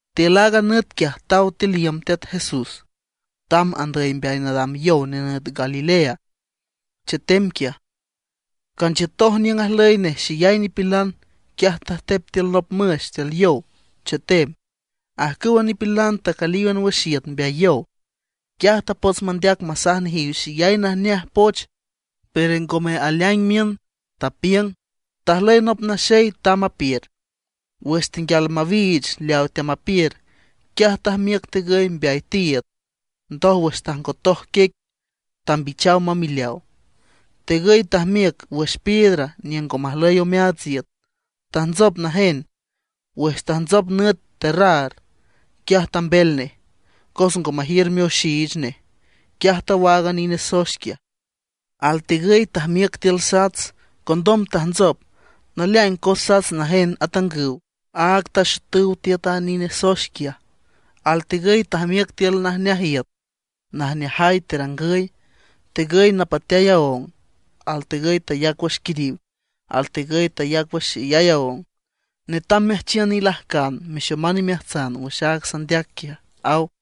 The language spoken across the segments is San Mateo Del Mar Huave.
Tiül aaga nüt quiaj taw tiül iüm Teat Jesús, tamb andüy mbeay nadam yow nenüt Galilea, chetem quiaj. Canchiütoj niüng ajlüy nej xeyay nipilan. Quiaj tajtep tiül nop müx tiül yow, chetem. Ajcüwa nipilan tacülíwan wüx iüt mbeay yow. Quiaj tapots mandeac masaj nejiw xeyay najneaj poch, pero ngome aleaing miün, tapiüng: ―Tajlüy nop naxey tamb apiür. Wüx tenguial mawiich leawa teamapiür, quiaj tajmiüc tigüy mbeay tiiüd, ndoj wüx tajngotoj quiec tambichaw mamileaw. Tigüy tajmiüc wüx piedra niüng ngo majlüy omeaats iüt. Tajntsop najen. Wüx tajntsop nüt terraar, quiaj tambel nej. Cos ngo majiür mioxiich nej, quiaj tawaag a nine soex quiaj. Altigüy tajmiüc tiül sats, condom tajntsop. Naleaing cos sats najen atangüw, áag taxotüw tiüt a nine soex quiaj. Altigüy tajmiüc tiül najneaj iüt, najneajay terangüy. Tigüy napateay taóng, altigüy tayac wüx quiriw, altigüy tayac wüx xeyay aóng. Netam meajchiün ilajcan, mexoman imeajtsan wüx aaga sandeac quiaj ―aw.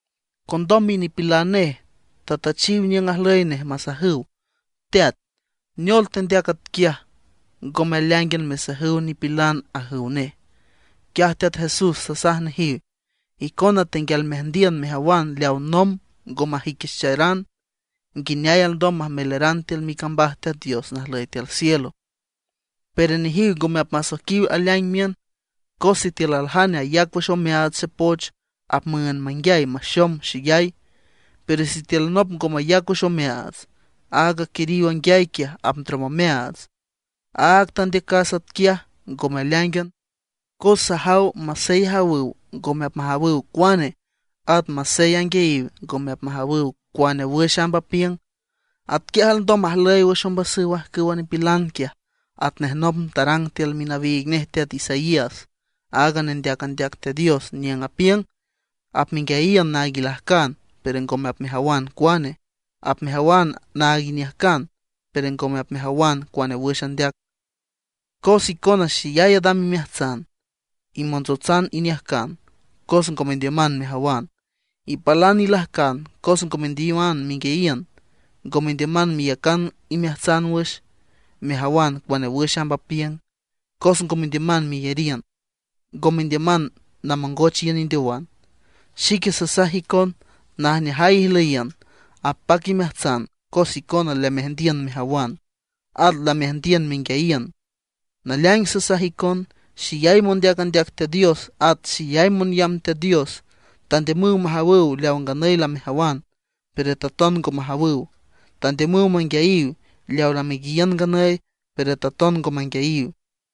Condom minipilan nej tatüchiw niüng ajlüy nej masajüw: ―Teat, ¿neol tendeac atquiaj, ngome aleaíngan mesajüw nipilana? ―ajüw nej. Quiaj Teat Jesús tasaj nejiw: ―Icona tenguial meajndiün mejawan leaw nomb ngo majüiquicharan, nguineay alndom majmeleran tiül micambaj Teat Dios najlüy tiül cielo. Pero nejiw ngome apmasoiquiw aleaing miün. Cos sitiül aljane ayac wüx omeaats xepoch, apmüünd manguiay maxom xeyay. Pero sitiül nop ngo mayac wüx omeaats, aaga quiriw anguiay quiaj apndrom omeaats. Áag tandeacas atquiaj ngome aleáingan, cos sajaw masey ajawüw ngome apmajawüw cuane, at masey anguiayiw ngome apmajawüw cuane wüx amb apiüng. Atquiaj alndom majlüy wüx ombasüw ajcüwa nipilan quiaj, atnej nomb tarang tiül minawiig nej teat Isaías, aaga nendeac andeac Teat Dios, niüng apiüng: Apmenguiayiün naag ilajcan, pero ngome apmejawan cuane; apmejawan naag iniüjcan, pero ngome apmejawan cuane wüx andeac. Cos icona xeyay adam imeajtsan; imontsotsan iniüjcan cos ngo mendiüman mejawan. Ipalan ilajcan cos ngo mendiüman menguiayiün. Ngo mendiüman meyacan imeajtsan wüx, mejawan cuane wüx amb apiüng; cos ngo mendiüman meyariün. Ngo mendiüman namongoch iün indeowan. ’Xique sasaj icon, najneajay ijlüyiün, apac imeajtsan cos icona lameajndiün mejawan, at lameajndiün menguiayiün. Naleaing sasaj icon, xeyay mondeac andeac Teat Dios at xeyay monyamb Teat Dios tandiümüw majawüw leaw nganüy lamejawan, pero taton ngo majawüw; tandiümüw manguiayiw leaw lamenguiayiün nganüy, pero taton ngo manguiayiw.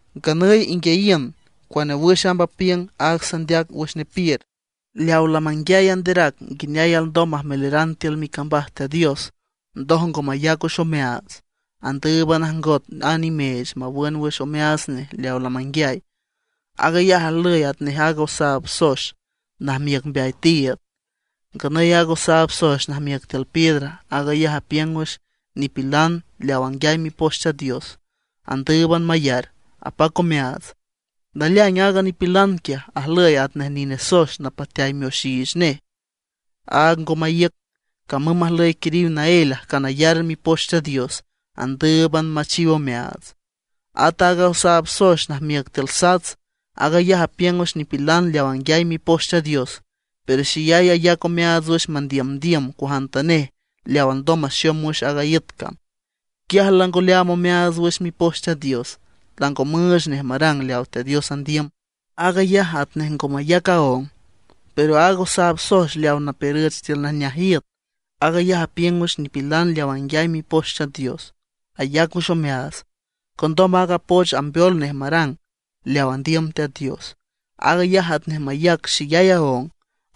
’Nganüy inguiayiün cuane wüx amb apiüng aaga sandeac wüx nepiür. Leaw lamanguiay anderac nguineay alndom majmeleran tiül micambaj Teat Dios, ndoj ngo mayac wüx omeaats, andǘüban ajngot a nimeech mawün wüx omeaats nej leaw lamanguiay. Aag ayaj ajlüy atnej aaga osaab soex najmiüc mbeay tiiüd. Nganüy aaga osaab soex najmiüc tiül piedra, aag ayaj apiüng wüx nipilan leawa anguiay Mipoch Teat Dios, andǘüban mayar, apac omeaats. Naleaing aaga nipilan quiaj ajlüy atnej nine soex napateay mioxiich nej. Áag ngo maíüc, camüm majlüy quiriw naél ajcan ayar Mipoch Teat Dios; andǘüban machiw omeaats. At aaga osaab soex najmiüc tiül sats, aag ayaj apiüng wüx nipilan leaw anguiay Mipoch Teat Dios, pero xeyay ayac omeaats wüx mandiümndiüm cuajantanej leaw alndom maxom wüx aaga iüt cam. Quiaj lango leaam omeaats wüx Mipoch Teat Dios, lango müüch nej marang leaw Teat Dios andiüm. Aag ayaj atnej ngo mayac aóng. Pero aaga osaab soex leaw napiürüch tiül najneaj iüt, aag ayaj apiüng wüx nipilan leaw anguiay Mipoch Teat Dios, ayac wüx omeaats, condom aaga poch ambeol nej marang leaw andiüm Teat Dios. Aag ayaj atnej mayac xeyay aóng.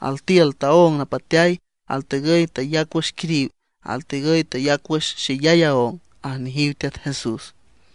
Altiül taóng napateay, altigüy tayac wüx quiriw, altigüy tayac wüx xeyay aóng ―aj nejiw Teat Jesús.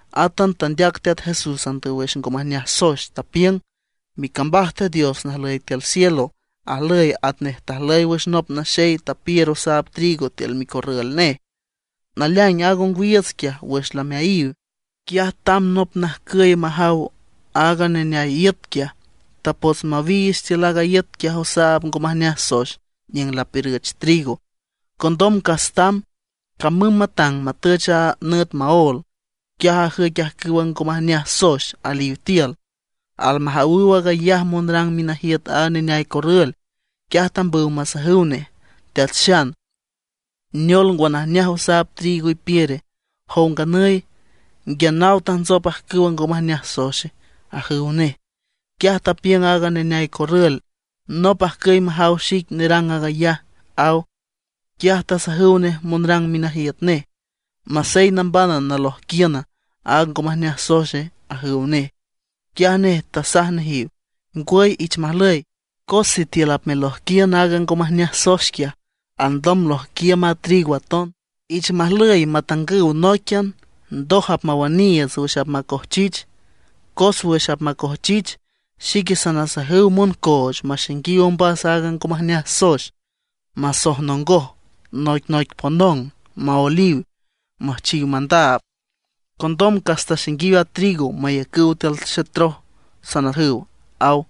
Átan tandeac Teat Jesús andüy wüx ngo majneaj soex, tapiüng: ―Micambaj Teat Dios najlüy tiül cielo ajlüy atnej tajlüy wüx nop naxey tapiür osaab trigo tiül micorrül nej. Naleaing aaga ongwiiüts quiaj wüx lameayiw, quiaj tamb nop najcüy majaw aaga neneay iüt quiaj, tapots mawiich tiül aaga iüt quiaj osaab ngo majneaj soex niüng lapiürüch trigo, condom cas tamb. Camüm matang matüch a nüt maól, quiaj lajüic ajcüwa ngo majneaj soex aliw tiül. Almajawüw aag ayaj monrang minajiüt aaga neneay corrül, quiaj tambüw masajüw nej: “Teat Xan, ¿neol ngwa, najneaj osaab trigo ipiüre? ¿Jow nganüy, nguia naw tajntsop ajcüwa ngo majneaj soexe?” ajüw nej. Quiaj tapiüng aaga neneay corrül: “Nop ajcüy majaw xic nerang aag ayaj”, aw. Quiaj tasajüw nej monrang minajiüt nej: “¿Masey nambana nalojquiün aaga ngo majneaj soexe?” ajüw nej. Quiaj nej tasaj nejiw: “Ngwüy, ich majlüy, cos sitiül apmelojquiün aaga ngo majneaj soex quiaj, alndom lojquiüm a trigo aton. Ich majlüy matangüw nóiquian, ndoj apmawüniiüts wüx apmacojchich. Cos wüx apmacojchich, xique sanasajüw moncooch maxainguiw ombas aaga ngo majneaj soex, masojnongon noic noic ponong, maoeliw, müjchiw mandaab. Condom cas taxainguiw a trigo mayacüw tiül xetroj, sanajüw” ―aw.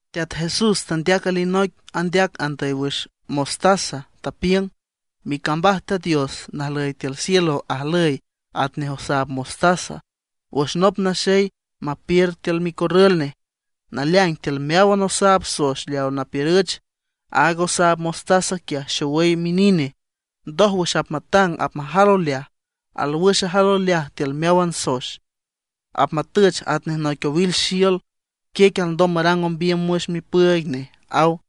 Teat Jesús tandeac alinoic andeac andüy wüx mostaza, tapiüng: ―Micambaj Teat Dios najlüy tiül cielo ajlüy atnej osaab mostaza wüx nop naxey mapiür tiül micorrül nej. Naleaing tiül meáwan osaab soex leaw napiürüch, aaga osaab mostaza quiaj xowüy minine. Ndoj wüx apmatang apmajal oleaj, alwüx ajal oleaj tiül meáwan soex, apmatüch atnej noic owil xiül. Quiec alndom marang ombiüm wüx mipüüig nej ―aw.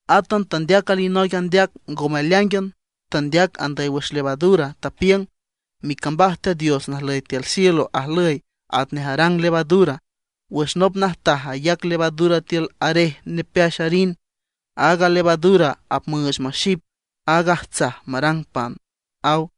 Átan tandeac alinoic andeac ngome aleáingan, tandeac andüy wüx levadura, tapiüng: ―Micambaj Teat Dios najlüy tiül cielo ajlüy atnej arang levadura. Wüx nop najtaj ayac levadura tiül arej nepeax arin, aaga levadura apmüüch maxip aaga ajtsaj marang pan ―aw.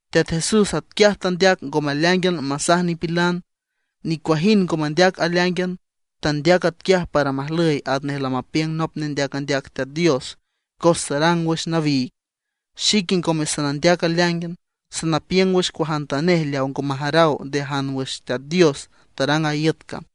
Teat Jesús atquiaj tandeac ngome aleáingan masaj nipilan. Nicuajind ngo mandeac aleáingan. Tandeac atquiaj para majlüy atnej lamapiüng nop nendeac andeac Teat Dios, cos tarang wüx nawiig: Xique ngome sanandeac aleáingan; sanapiüng wüx cuajantanej leaw ngo majaraw nde ajan wüx Teat Dios tarang aaga iüt cam.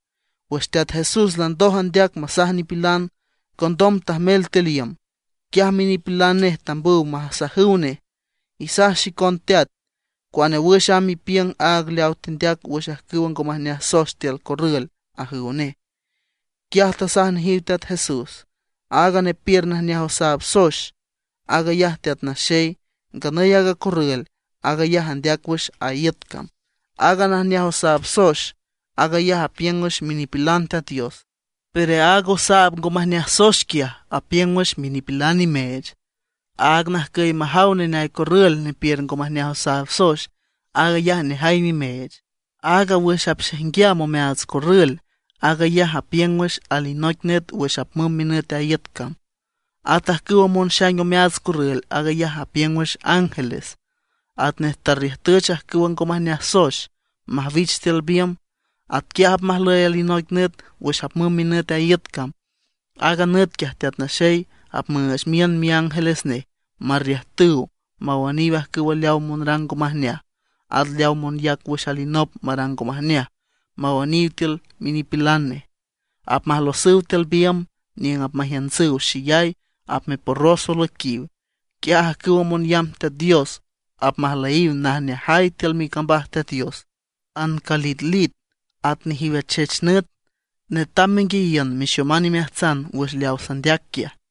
Wüx Teat Jesús landoj andeac masaj nipilan, condom tajmel tiül iüm. Quiaj minipilan nej tambüw masajüw nej: ―Isaj xicon teat, cuane wüx amb apiüng aaga leaw tendeac wüx ajcüwa ngo majneaj soex tiül corrül ―ajüw nej. Quiaj tasaj nejiw Teat Jesús: ―Aaga nepiür najneaj osaab soex, aag ayaj Teat Naxey. Nganüy aaga corrül, aag ayaj andeac wüx a iüt cam. Aaga najneaj osaab soex, aag ayaj apiüng wüx minipilan Teat Dios. Pero aaga osaab ngo majneaj soex quiaj apiüng wüx minipilan nimeech. Aaga najcüy majaw neneay corrül nepiür ngo majneaj osaab soex, aag ayaj nejay nimeech. Aaga wüx apxaijnguiam omeaats corrül aag ayaj apiüng wüx alinoic nüt wüx apmümb minüt a iüt cam. At ajcüwa monxaing omeaats corrül, aag ayaj apiüng wüx ángeles. Atnej tarriüjtüch ajcüwa ngo majneaj soex majwich tiül biümb, atquiaj apmajlüy alinoic nüt wüx apmümb minüt a iüt cam. Aaga nüt quiaj Teat Naxey apmüüch miün miángeles nej marriüjtüw mawüniw ajcüw leaw monrang ngo majneaj, at leaw monyac wüx alinop marang ngo majneaj, mawüniw tiül minipilan nej. Apmajlosüw tiül biümb niüng apmajiüntsüw xeyay, apmeporros olüiquiw. Quiaj ajcüwa monyamb Teat Dios apmajlüyiw najneajay tiül micambaj Teat Dios, ancalitlit at nejiw achech nüt. Netam menguiayiün, mexoman imeajtsan wüx leaw sandeac quiaj.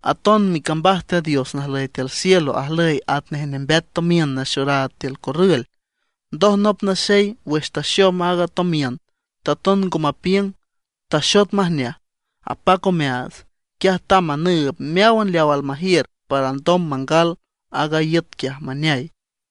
’Aton micambaj Teat Dios najlüy tiül cielo ajlüy atnej nembeat tomiün naxoraad tiül corrül. Ndoj nop naxey wüx taxom aaga tomiün taton ngo mapiüng, taxot majneaj, apac omeaats, quiaj tamb manüüb meáwan leaw almajiür para alndom mangal aaga iüt quiaj maneay.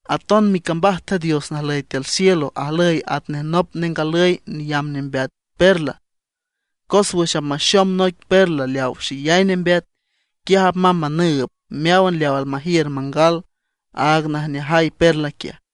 ’Aton micambaj Teat Dios najlüy tiül cielo ajlüy atnej nop nengalüy neyamb nembeat perla. Cos wüx apmaxom noic perla leaw xeyay nembeat, quiaj apmamb manüüb meáwan leaw almajiür mangal aaga najneajay perla quiaj.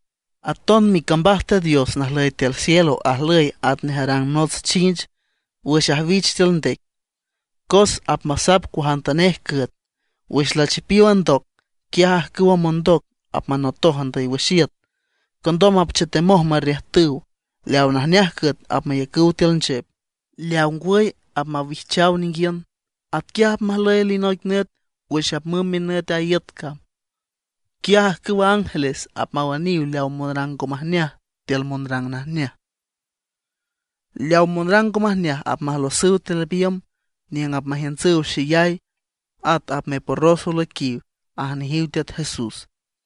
’Aton micambaj Teat Dios najlüy tiül cielo ajlüy atnej arang nots chinch wüx ajwich tiül ndec, cos apmasap cuajantanej cüet. Wüx lachipiow a ndoc, quiaj ajcüwa mondoc apmanotoj andüy wüx iüt. Condom apchetemoj marriüjtüw. Leaw najneaj cüet apmayacüw tiül nchep, leaw ngwüy apmawijchaw ninguiün. Atquiaj apmajlüy alinoic nüt wüx apmümb minüt a iüt cam. Quiaj ajcüwa ángeles apmawüniw leaw monrang ngo majneaj tiül monrang najneaj. Leaw monrang ngo majneaj apmajlosüw tiül biümb niüng apmajiüntsüw xeyay, at apmeporros olüiquiw ―aj nejiw Teat Jesús.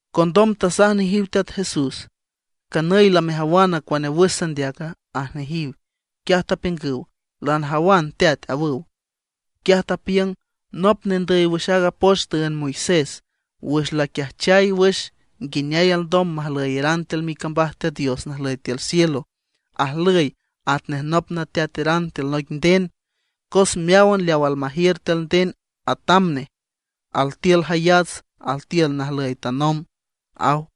Condom tasaj nejiw Teat Jesús: ―¿Canüy lamejawan cuane wüx sandeaca? ―aj nejiw. Quiaj tapiüngüw: ―Lanajawan teat ―awüw. Quiaj tapiüng: ―Nop nendüy wüx aaga poch tüünd Moisés, wüx laquiajchay wüx nguineay alndom majlüyeran tiül micambaj Teat Dios najlüy tiül cielo, ajlüy atnej nop nateateran tiül noic nden. Cos meáwan leaw almajiür tiül nden atam nej, altiül jayats, altiül najlüy tanomb ―aw.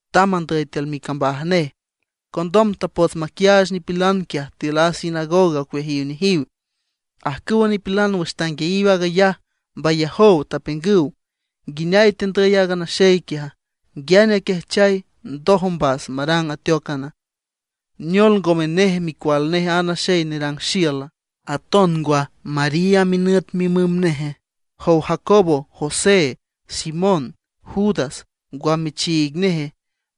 Tamb andüy tiül micambaj nej. Condom tapots maquiaach nipilan quiaj tiül a sinagoga ocueajiw nejiw. Ajcüwa nipilan wüx tanguiayiw aag ayaj mbayajow, tapiüngüw: ―¿Nguineay tendüy aaga naxey quiaja? ¿Nguiane aquiajchay ndoj ombas marang ateócan? ¿Neol ngome nej micual aaga naxey nerang xiüla? Aton ngwa, ¿María minüt mimüm neje? ¿Jow Jacobo, José, Simón, Judas, ngwa michiig neje?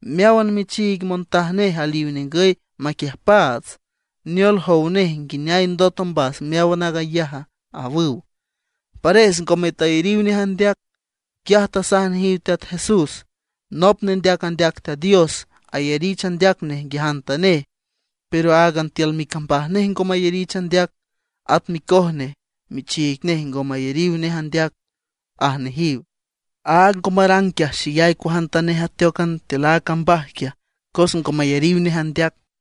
Meáwan michiig montaj nej aliw ningüy maquiüjpaats. ¿Neol, jow nej nguineay ndot ombas meáwan aag ayaja? ―awüw. Pares ngome tayariw nej andeac. Quiaj tasaj nejiw Teat Jesús: ―Nop nendeac andeac Teat Dios ayarich andeac nej nguiajantanej; pero áagan tiül micambaj nej ngo mayarich andeac, at micoj nej michiig nej ngo mayariw nej andeac ―aj nejiw. Áag ngo marang quiaj xeyay cuajantanej ateócan tiül a cambaj quiaj, cos ngo mayariw nej andeac.